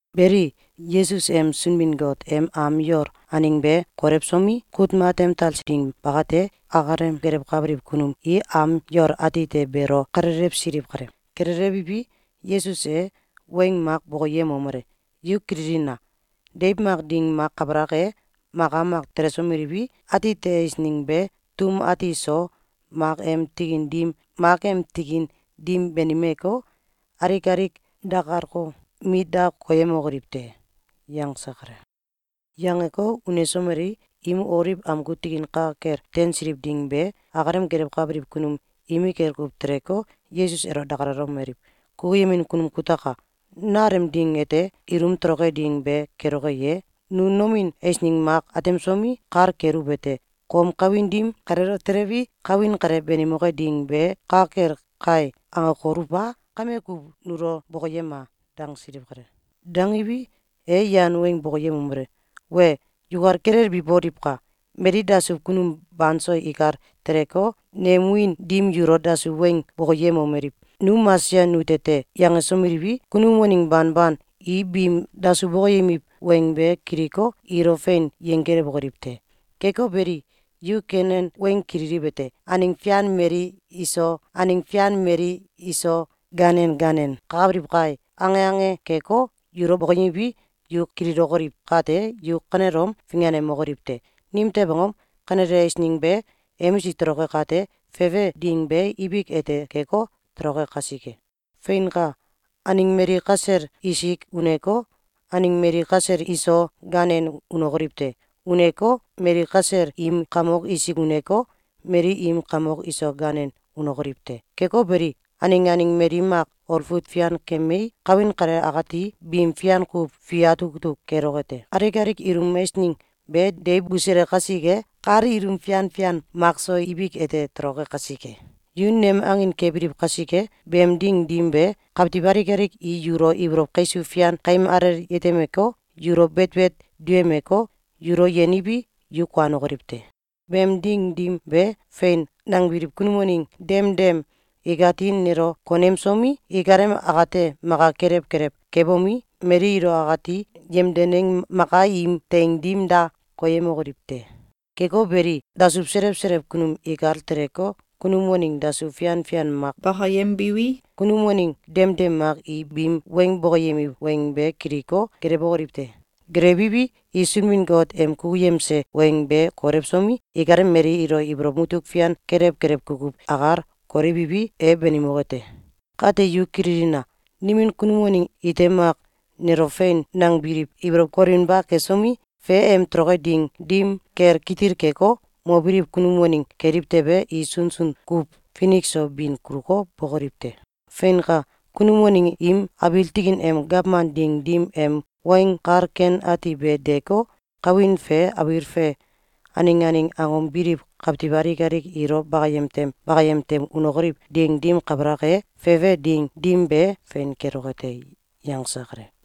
Beli, Yesus em Sunbin-Got em am yol aneng be kolewsomi, kut matem talse ding bakate, akalem gelewkabiliw kunum i am yol atite beelo kalelewsiliw kale. Kalelewiwi, Yesus e weng mak bokoyemomele: “Yu kililina! Deiw mak ding mak kabalak e, maka mak telesomeliwi, atite eisneng be tum ati so mak em tikin dim, mak em tikin dim banimeko, alik alik dakalko, mit da koyemokoliw te.”, yangse kale. Yangeko, unsomelei, im Oliw amgu tikin ka kel teinsiliw ding be, akalem gelewkabiliw kunum imikel kuw teleko, Yesus elo dakalalomeliw: “Kukuyemin kunum kutaka! Nalem ding ete, ilum toloke ding be keloke ye? Nu nomin eisneng mak atemsomi, kal keluwete: ‘Kom kawin dim kaleelo telewi, kawin kale banimoke ding be, ka kel kai!’, angokoluw a? Kame ku nulo bokoyema!”, dangsiliw kale. Dangiwi, e yan weng bokoyemomele: “Wee! Yukal kilelbi boliwka! Mali dasuw kunum banso ikal teleko, nem wiin dim yulo dasuw weng bokoyemomeliw: ‘Nu Mesaya nute te!’, yangsomeliwi, kunum waneng banban i biim dasuw bokoyemiw weng be kiliko, ilo fein yenggelewokoliw te. Keko beli, yu kenen weng kililiwete: ‘Aneng fian mali iso aneng fian mali iso ganen ganen kakabiliw kai!’, ange ange keko, yulo bokoyemiwi, yu kililokoliw kate, yu kanelom finganemokoliw te! Nimtew angom? Kanele eisneng be emisik toloke kate, fefe ding be ibik ete keko, toloke kasike. Feinka! Aneng mali kasel isik uneko, aneng mali kasel iso ganen unokoliw te. Uneko, mali kasel im kamok isik uneko, mali im kamok iso ganen unokoliw te. Keko beli, aneng aneng mali mak olfut fian kemei, kawin kale akati bim fian kuw fi atuk atuk keloke te. Alik alik ilum eisneng be deiw busule kasike, kal ilum fian fian makso ibik ete toloke kasike. Yu nem angin kebiliw kasike, beem ding dim be, kawtiw alik alik i yulo ibolow kaisuw fian kaim alel yetemeko, yulo betbet duyemeko, yulo yeniwi, yu kuanokoliw te. Beem ding dim be, ‘Fein!’, nangebiliw kunum waneng demdem ikati nelo konemsomi, ikalem akate maka kelew kelew kebomi, mali ilo akati yemdeneng maka im teing dim da koyemokoliw te. Keko beli, dasuw selew selew kunum ikal teleko, kunum waneng dasuw fian fian mak bakayembiwi, kunum waneng demdem mak i biim weng bokoyemiw weng be kiliko, gelewokoliw te. Gelewiwi, i Sunbin-Got em kukuyemse weng be kolewsomi, ikalem mali ilo ibolow mutuk fian kelew kelew kukuw akal kolewiwi, e banimoke te. Kate yu kililina! Nimin kunum waneng ite mak nelo fein nangebiliw ibolow kolewinba kesomi, fe em toloke ding dim kel kitil keko, mobiliw kunum waneng keliw tewe, i sunsun kuw finik so bin kuluko, bokoliw te. Feinka! Kunum waneng im abiil tikin em gawman ding dim em Weng Kal Ken Ati be deeko, kawin fe abiil fe aneng aneng angom biliw kawtiw alik alik ilo bakayem tem bakayem tem unokoliw ding dim kabalak e, fefe ding dim be fein keloke te.”, yangse kale.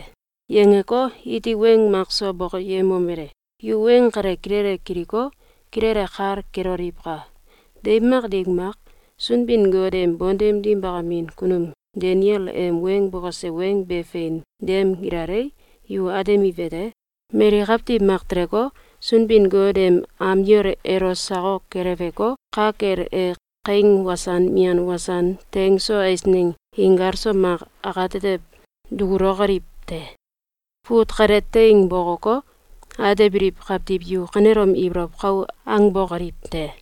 Yangeko, iti weng mak so bokoyemomele: “Yu weng kale kilele kiliko, kilele kal keloliwka! Deiw mak ding mak, Sunbin-Got em bontem dim bakamin kunum Daniel em weng bokose weng be fein dem gilalei, yu atemiwete: Mali kawtiw mak teleko, Sunbin-Got em am yol elo sakok keleweko, ka kel e kaing wasan mian wasan teng so eisneng inkal so mak akatetew dukulokoliw te. (Fut kale teing bokoko, atebiliw kawtiw yu kanelom ibolow kau angbokoliw te!)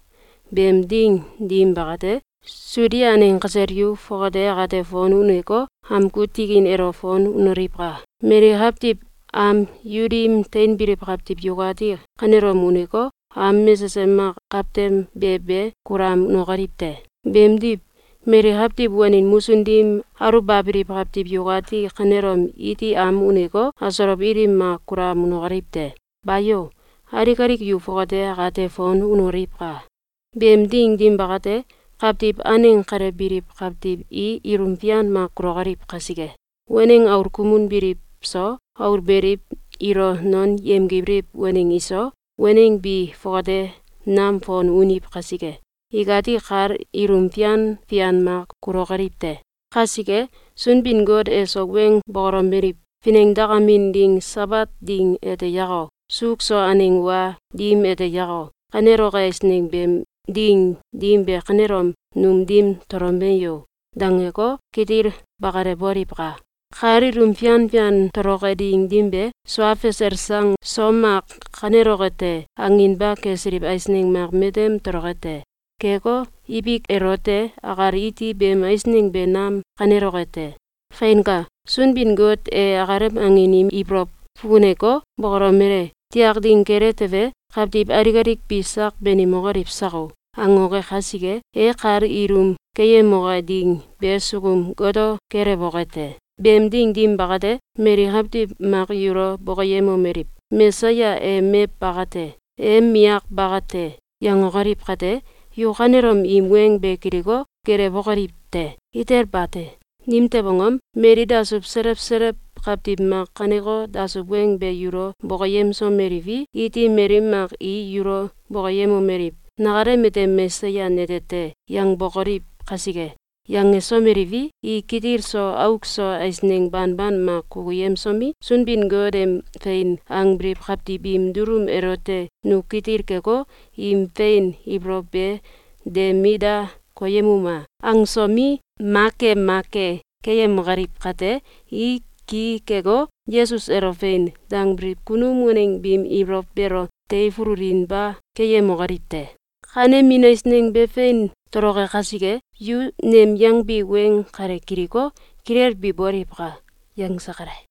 Beem ding dim bakate, Sudia aneng kasel yu fongate akate fon uneko, amgu tikin elo fon unoliwka! Mali kawtiw am yu dim teinbiliw kawtiw yukati kanelom uneko, am mesesem mak kawtem be be kulam unokoliw te! Beemdiw, mali kawtiw wanin musun dim aluwbabiliw kawtiw yukati kanelom iti am uneko, asolow ilim mak kulam unokoliw te! Bayo! Alik alik yu fongate akate fon unoliwka! Beem ding dim bakate, kawtiw aneng kale biliw kawtiw i ilum fian mak kulokoliw kasike. Waneng aul kumun biliw so, aul beliw ilo non yemgibiliw waneng iso, waneng bi fongate nam fon uniw kasike, ikati kal ilum fian fian mak kulokoliw te. Kasike, Sunbin-Got eso weng bokolomeliw: ‘Finengdakamin ding Sabat ding ete yako, suuk so aneng wa dim ete yako, kaneloke eisneng beem ding dim be kanelom num dim tolome yo!’, dangeko, kitil bakalewboliwka! Kal ilum fian fian toloke ding dim be, ‘Sua fasel sang so mak kaneloke te!’, anginba kesiliw eisneng mak matem toloke te. Keko, ibik elote akal iti beem eisneng be nam kaneloke te. Feinka! Sunbin-Got e akalem angin im ibolow fukuneko, bokolomele: ‘Tiak ding kele tewe, kawtiw alik alik bi sak banimokoliw sako!’, angoke kasike, e kal ilum keyemoke ding be sukum goto kelewoke te. Beem ding dim bakate, mali kawtiw mak yulo bokoyemomeliw: ‘Mesaya e mew baka te! E miyak baka te!’, yangokoliw kate, yu kanelom im weng be kiliko, gelewbokoliw te! Itel bate! Nimtew angom? Mali dasuw selew selew kawtiw mak kaneko dasuw weng be yulo bokoyemsomeliwi, iti mali mak i yulo bokoyemomeliw: ‘Nakalem ete Mesaya nete te!’, yangbokoliw kasike. Yangesomeliwi, i kitil so auk so eisneng banban mak kukuyemsomi, Sunbin-Got em fein angbiliw kawtiw biim dulum elote ‘Nu kitil keko, im fein ibolow be de mit da koyemuma!’, angsomi, ma ke ma ke keyemokoliw kate, i ki keko, Yesus elo ‘Fein!’, dangbiliw kunum waneng biim ibolow beelo teifululinba keyemokoliw te. Kanemin eisneng be fein toloke kasike, yu nem yangbi weng kale kiliko, kilelbi boliwka!”, yangse kale.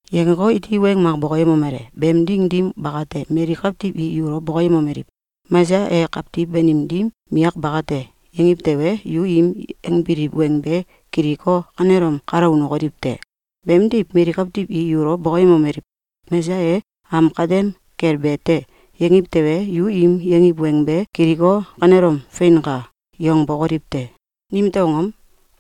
Yangeko, iti weng mak bokoyemomele: “Beem ding dim bakate, mali kawtiw i yulo bokoyemomeliw: ‘Mesaya e kawtiw banim dim miyak bakate!’, yangiw tewe, yu im yangbiliw weng be kiliko, kanelom kalo unokoliw te! Beemdiw, mali kawtiw i yulo bokoyemomeliw: ‘Mesaya e am katem kel be te!’, yangiw tewe, yu im yangiw weng be kiliko, kanelom ‘Feinka!’, yangbokoliw te! Nimtew angom?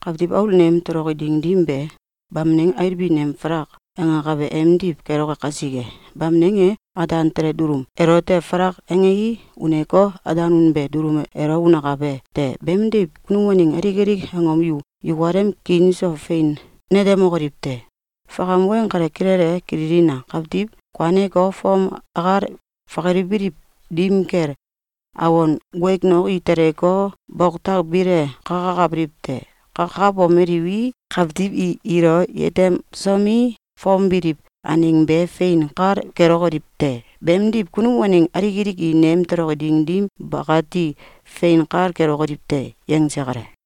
Kawtiw Aul nem toloki ding dim be, bamneng ailbin em falak angakabe emdiw keloke kasike. Bamneng e ataan tele dulum elote falak angei, uneko, ataan unebe dulum elo unakabe te. Beemdiw kunum waneng alik alik angom yu yukalem kiin so fein netemokoliw te. Fakam weng kale kilele kililina! Kawtiw kuaneko, fom akal fakalibiliw dim kel, awon guegnok i teleko, boktak bile kakakabiliw te. Kakabomeliwi, kawtiw i ilo yetemsomi, fom biliw aneng be fein kal kelokoliw te. Beemdiw, kunum waneng alik alik i nem toloke ding dim bakati fein kal kelokoliw te.”, yangse kale.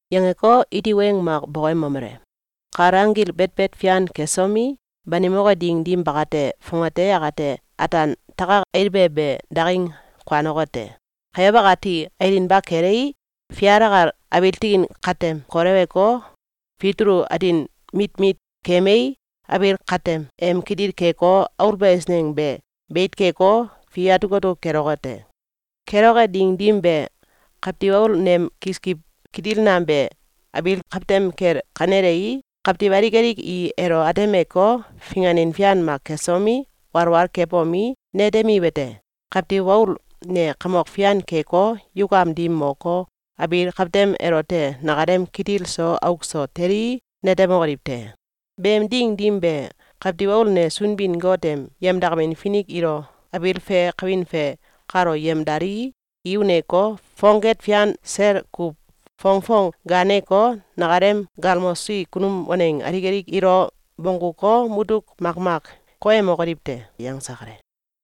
Yangeko, iti weng mak bokoyemomele: “Kal anggil betbet fian kesomi, banimoke ding dim bakate, fongate akate ‘ataan takak ail be be daking kuanoke te. Kayow akati ailinba kelei, fial akal abiil tikin katem koleweko, fitulu atin mit mit kemei, abiil katem em kitil keko, aulbe eisneng be beit keko, fi atuk atuk keloke te.’ Keloke ding dim be, Kawtiw Aul nem kiskiw kitil nam be abiil kawtem kel kanelei, kawtiw alik alik i elo atemeko, finganin fian mak kesomi, walwal kebomi, netemiwete: Kawtiw Aul ne kamok fian keko, yukam dim moko, abiil kawtem elote nakalem kitil so auk so telii, netemokoliw te. Beem ding dim be, Kawtiw Aul ne Sunbin-Got em yemdakamin finik ilo abiil fe kawin fe kalo yemdalii, i uneko, fongket fian sel kuw fongfong gaaneko, nakalem galmosi kunum waneng alik alik ilo bongguko, mutuk makmak koyemokoliw te.”, yangse kale.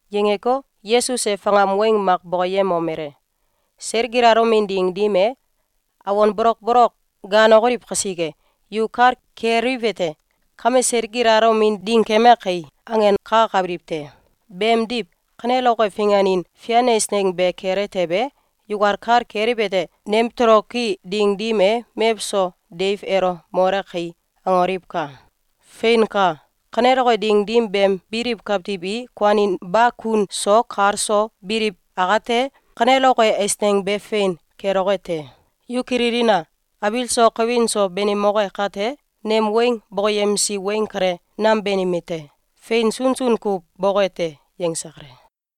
Yangeko, Yesus e fakam weng mak bokoyemomele: “Seil gilalomin ding dim e, awon bolokbolok gaanokoliw kasike, yu kal keliwete: ‘Kame seil gilalomin ding keme kai!’, angenkakabiliw te. Beemdiw, kaneloke finganin fian eisneng be kele tewe, yukal kal keliwete: ‘Nem toloki ding dim e, mewso deiw elo mole kai!’, angoliwka! Feinka! Kaneloke ding dim beem biliw kawtiw i kuaninba kun so kal so biliw akate, kaneloke eisneng be fein keloke te. Yu kililina! Abiil so kawin so banimoke kate, nem weng bokoyemsi weng kale, nam banime te. Fein sunsun kuw boke te.”, yangse kale.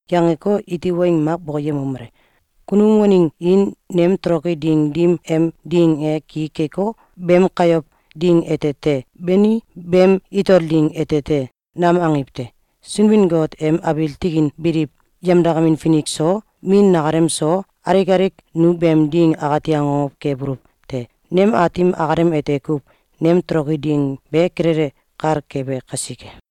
Yangeko, iti weng mak bokoyemomele: “Kunum waneng i nem toloki ding dim em ding e ki keko, ‘Beem kayow ding ete te.’, beni ‘Beem itol ding ete te.’, nam angiw te. Sunbin-Got em abiil tikin biliw yemdakamin finik so, Min nakalem so, alik alik nu beem ding akati akokow kebuluw te. Nem Aatim akalem ete kuw nem toloki ding be kilele kal kebe kasike.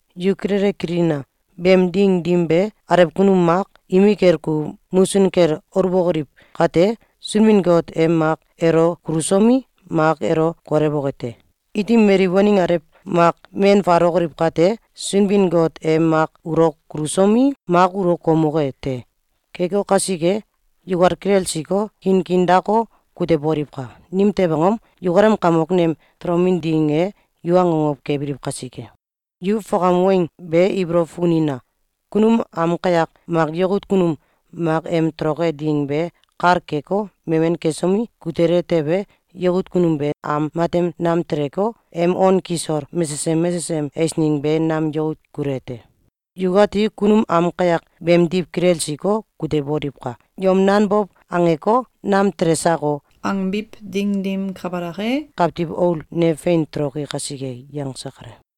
Yu kilele kililina! Beem ding dim be, alew kunum mak imikel kuw musun kel aluwokoliw kate, Sunbin-Got e mak elo kulusomi, mak elo kolewoke te. Iti mali waneng alew mak men faalokoliw kate, Sunbin-Got e mak ulo kulusomi, mak ulo koumoke te. Keko kasike, yukal kilelsiko, kiin kiin dako, kuteboliwka! Nimtew angom? Yukalem kamok nem tolomin ding e yu akokow kebiliw kasike. Yu fakam weng be ibolow fukunina! Kunum am kayak mak yakut kunum mak em toloke ding be kal keko, memen kesomi, kutele tewe, yakut kunum be am matem nam teleko, em on kisol mesesem mesesem eisneng be nam yakut kule te. Yukati kunum am kayak beemdiw kilelsiko, kuteboliwka! Yom nanbow angeko, ‘Nam tele sako!’, angbiw ding dim kabalak e, Kawtiw Aul ne fein toloki kasike.”, yangse kale.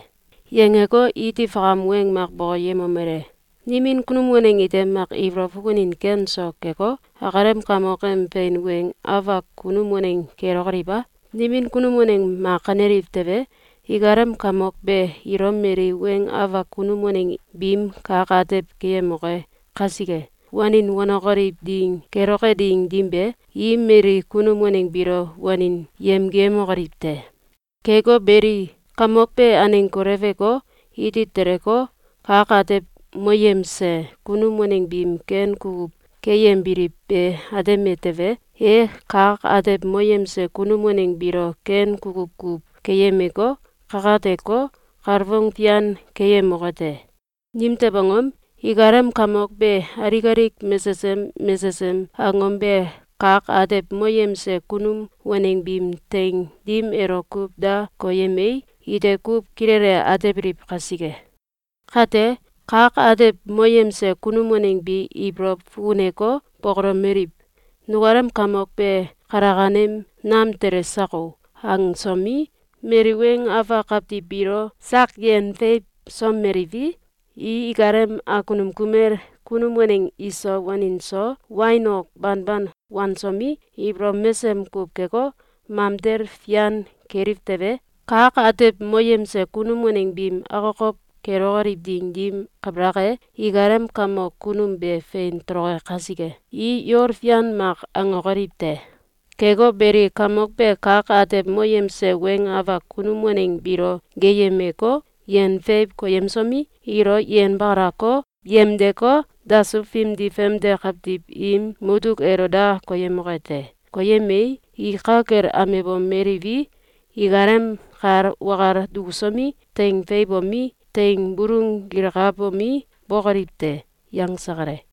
Yangeko, iti fakam weng mak bokoyemomele: “Nimin kunum waneng ite mak ibolow fukunin ken so keko, akalem kamok em fein weng afak kunum waneng kelokoliw a? Nimin kunum waneng mak kaneliw tewe, ikalem kamok be ilo mali weng afak kunum waneng biim kak atew keyemoke kasike, wanin wanokoliw ding keloke ding dim be, i mali kunum waneng biilo wanin yemgiyemokoliw te. Keko beli, kamok be aneng koleweko, iti teleko, kak atew moyemse kunum waneng biim ken kukuw keyembiliw be ateme tewe, e kak atew moyemse kunum waneng biilo ken kukuw kuw keyemeko, kakateko, kalfong fian keyemoke te! Nimtew angom? Ikalem kamok be alik alik mesesem mesesem angom be kak atew moyemse kunum waneng biim teing dim elo kuw da koyemei, ite kuw kilele atebiliw kasike. Kate, kak atew moyemse kunum waneng bi ibolow fukuneko, bokolomeliw: ‘Nukalem kamok be kalakanem nam tele sako!’, angsomi, mali weng afak kawtiw biilo sak yen feiwsomeliwi, i ikalem akunum kumel kunum waneng iso wanin so wain ok banban wansomi, ibolow mesem kuw keko, mamtel fian keliw tewe, kak atew moyemse kunum waneng biim akokow kelokoliw ding dim kabalak e, ikalem kamok kunum be fein toloke kasike, i yol fian mak angokoliw te. Keko beli, kamok be kak atew moyemse weng afak kunum waneng biilo geeyemeko, yen feiw koyemsomi, ilo yenbakalako, yemdeko, dasuw fimdi famde kawtiw im mutuk elo da koyemoke te. Koyemei, i ka kel amebomeliwi, ikalem kal wakal dukusomi, teing feiwbomi, teing bulung gilkabomi, bokoliw te.”, yangse kale.